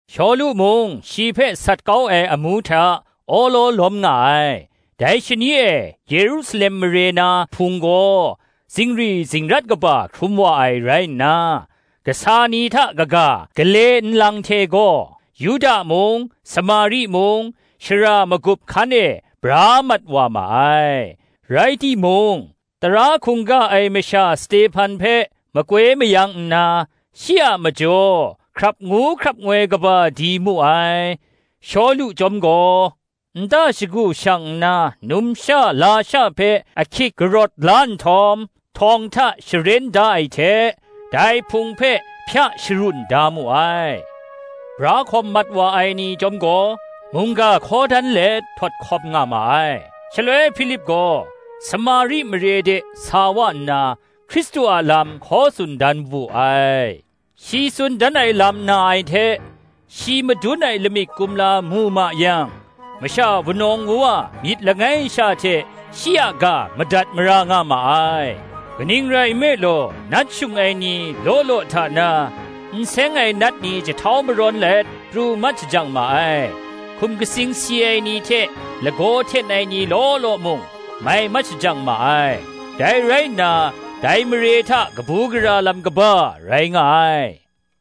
Shawlu mung shi hpe sat kau ai amu hta awlaw lawm nga ai. Dai shani e Yerusalem mare na Hpung gaw zingri zingrat kaba hkrum wa ai rai nna, kasa ni hta kaga, gale nlang hte gaw, Yuda mung, Samari mung, shara magup hkan e bra mat wa ma ai. Rai timung, tara hkungga ai masha Stehpan hpe makoi mayang nna, shi a majaw hkrap ngu hkrap ngoi kaba di mu ai. Shawlu chyawm gaw, nta shagu shang nna, numsha lasha hpe ahkyit karawt la nhtawm, htawng hta sharen da ai hte, dai Hpung hpe hpya sharun da mu ai. Bra hkawm mat wa ai ni chyawm gaw, mungga hkaw dan let htawt hkawm nga ma ai. Shaloi Hpilip gaw Samari mare de sa wa nna, Hkristu a lam hkaw tsun dan wu ai. Shi tsun dan ai lam na ai hte, shi madun ai lamik kumla mu ma yang, masha wunawng wuwa myit langai sha hte shi a ga madat mara nga ma ai. Kaning rai nme law, nat shung ai ni law law hta na, n seng ai nat ni jahtau marawn let pru mat shajang ma ai; hkum katsing si ai ni hte lagaw hten ai ni law law mung, mai mat shajang ma ai. Dai rai nna, dai mare hta kabu gara lam kaba rai nga ai.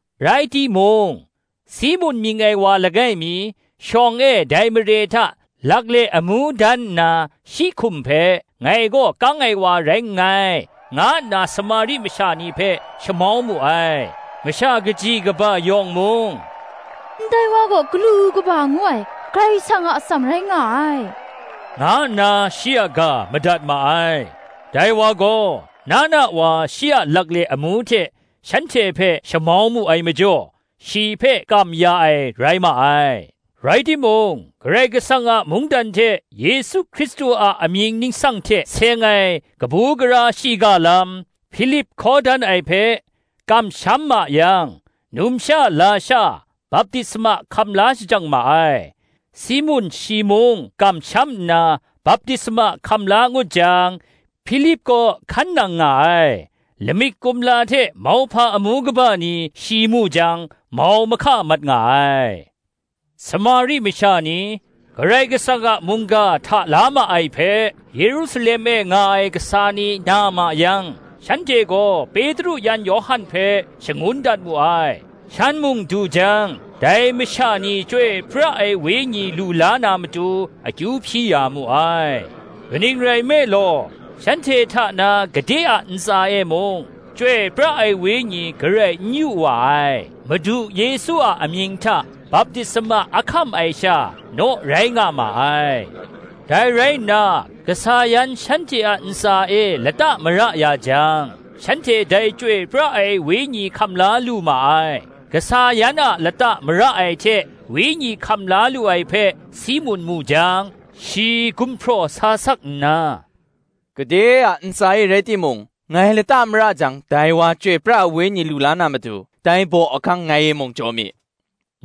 Rai timung, Simun mying ai wa langai mi, shawng e dai mare hta lakle amu dan nna, shi hkum hpe, “Ngai gaw kang ai wa rai nngai,” nga nna Samari masha ni hpe shamau mu ai: masha kaji kaba yawng mung, “Ndai wa gaw, Galu kaba ngu ai, Karai Kasang a atsam rai nga ai,” nga nna shi a ga madat ma ai. Dai wa gaw, na na wa shi a lakle amu hte shanhte hpe shamau mu ai majaw, shi hpe kam ya ai rai ma ai. Rai timung, Karai Kasang a mungdan hte Yesu Hkristu a amying ningsang hte seng ai kabu gara shiga lam, Hpilip hkaw dan ai hpe, kamsham ma yang, numsha lasha baptisma hkam la shajang ma ai. Simun shi mung kamsham nna, baptisma hkam la ngut jang, Hpilip kaw hkan nang nga ai: lamik kumla hte mauhpa amu kaba ni shi mu jang, mau mahka mat nga ai. Samari masha ni, Karai Kasang a mungga hta la ma ai hpe, Yerusalem e nga ai kasa ni na ma yang, shanhte gaw Petru yan Yawhan hpe shangun dat mu ai: shan mung du jang, dai masha ni Chyoi pra ai Wenyi lu la na matu akyu hpyi ya mu ai: kaning rai nme law, shanhte hta na gade a ntsa e mung, Chyoi pra ai Wenyi garai n yu wa ai; Madu Yesu a amying hta baptisma a hkam ai sha, naw rai nga ma ai. Dai rai nna kasa yan shanhte a ntsa e lata mara ya jang, shanhte dai Chyoi pra ai Wenyi hkam la lu ma ai. Kasa yan a lata mara ai hte Wenyi hkam la lu ai hpe Simun mu jang, shi gumhpraw sa sak nna, “Gade a ntsa e rai timung ngai lata mara jang, dai wa Chyoi pra ai Wenyi lu la na matu, dai baw ahkang ngai e mung jaw mi,”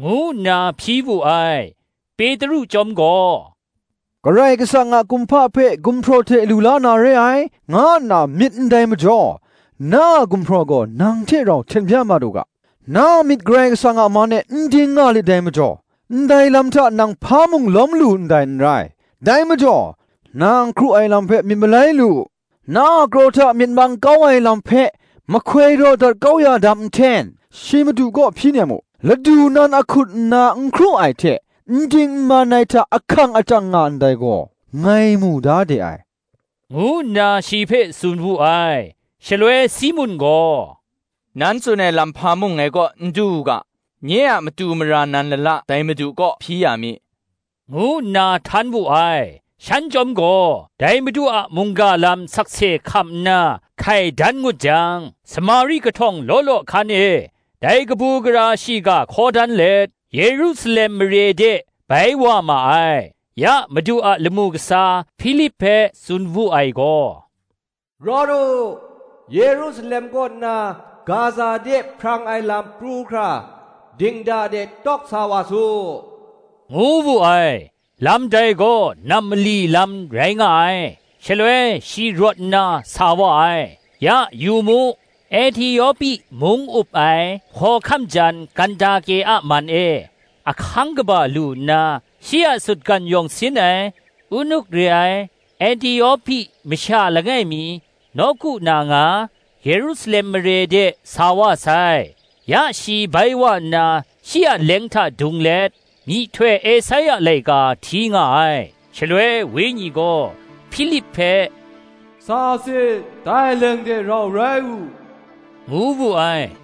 ngu nna hpyi wu ai. Petru chyawm gaw, “Karai Kasang a kumhpa hpe gumhpraw hte lu la na re ai, nga nna myit ndai majaw, na a gumhpraw gaw nang hte rau hten bya mat u ga, Na a myit Karai Kasang a man e n ding nga lit dai majaw, ndai lam hta nang hpa mung lawm lu ndai n rai. Dai majaw, na n hkru ai lam hpe myit malai lu u; na a kraw hta myit mang kau ai lam hpe, mahkoi raw dat kau ya dam nhten, shi Madu kaw hpyi nem u. Ladu nan ahkut nna n hkru ai hte, n ding n man ai hta ahkang achyang nga ndai gaw, ngai mu da de ai,” ngu nna shi hpe tsun wu ai. Shaloi Simun gaw, “Nan tsun ai lam hpa mung ngai kaw n du u ga, nye a matu mara nan lala dai Madu kaw hpyi ya mi,” ngu nna htan wu ai. Shan chyawm gaw, dai Madu a mungga lam sakse hkam nna hkai dan ngut jang, Samari kahtawng law law hkan e dai kabu gara shiga hkaw dan let, Yerusalem mare de bai wa ma ai. Ya, Madu a lamu kasa Hpilip hpe tsun wu ai gaw, “Rawt u; Yerusalem kaw nna Gaza de hprang ai lam pru hkra, dingda de tawk sa wa su,” ngu wu ai; lam dai gaw nam mali lam rai nga ai. Shaloi shi rawt nna sa wa ai; ya yu mu, Ehtiopi mung up ai hkawhkam jan Kandake a man e ahkang kaba lu nna, shi a sutgan yawng sin ai, unuk re ai, Ehtiopi masha langai mi, nawku na nga, Yerusalem de sa wa sai: ya shi bai wa nna, shi a leng hta dung let, myihtoi Esaia laika hti nga ai. Shaloi Wenyi gaw Hpilip hpe, “Sa sit, dai leng de rau rai u,” ngu wu ai.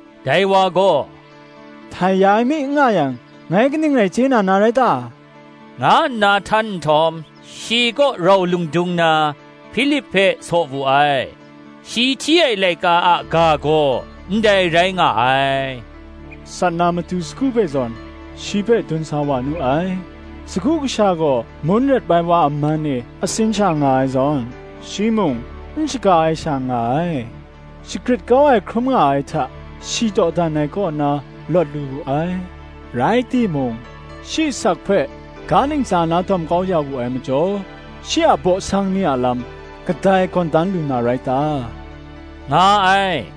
Dai wa gaw, “Htai ya ai mi n nga yang, ngai kaning rai chye na na rai ta?” nga nna htan nhtawm, shi kaw rau lung dung na, Hpilip hpe saw wu ai. Shi hti ai laika a ga gaw ndai rai nga ai, “Sat na matu sagu hpe zawn, shi hpe dun sa wa nu ai; Sagu kasha gaw mun rep ai wa a man e atsin sha nga ai zawn, Shi mung n shaga ai sha nga ai. Shagrit kau ai hkrum nga ai hta, shi dawdan ai kaw na lawt lu wu ai: Rai timung shi asak hpe ga ntsa na dawm kau ya wu ai majaw, Shi a baw sang ni a lam, kadai gawn dan lu na rai ta?” nga ai.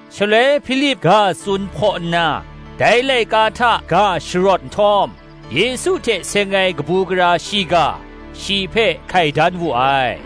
Shaloi Hpilip ga tsun hpaw nna, dai laika hta ga sharawt nhtawm, Yesu hte seng ai kabu gara shiga, shi hpe hkai dan wu ai.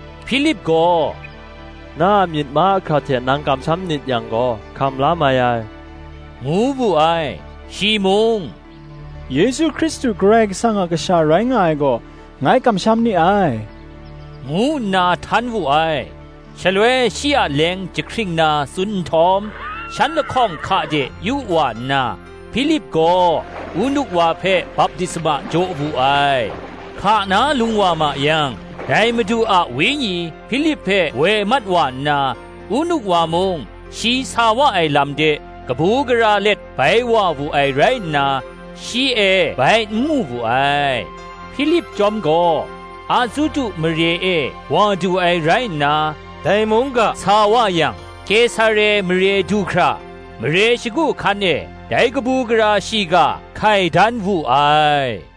(Hpilip gaw, “Na a myit mahkra hte nang kamsham nit yang gaw hkam la mai ai,” ngu wu ai. Shi mung, “Yesu Hkristu Karai Kasang a kasha rai nga ai gaw, ngai kamsham ni ai,” ngu nna htan wu ai) Shaloi shi a leng jahkring na tsun nhtawm, shan lahkawng hka de yu wa nna, Hpilip gaw Unuk wa hpe baptisma jaw wu ai. Hka na lung wa ma yang, dai Madu a Wenyi Hpilip hpe woi mat wa nna, Unuk wa mung shi sa wa ai lam de kabu gara let bai wa wu ai rai nna, shi e bai n mu wu ai. Hpilip chyawm gaw, Azutu mare e wa du ai rai nna, dai mung ga sa wa yang, Kesare mare du hkra mare shagu hkan e dai kabu gara shiga hkai dan wu ai.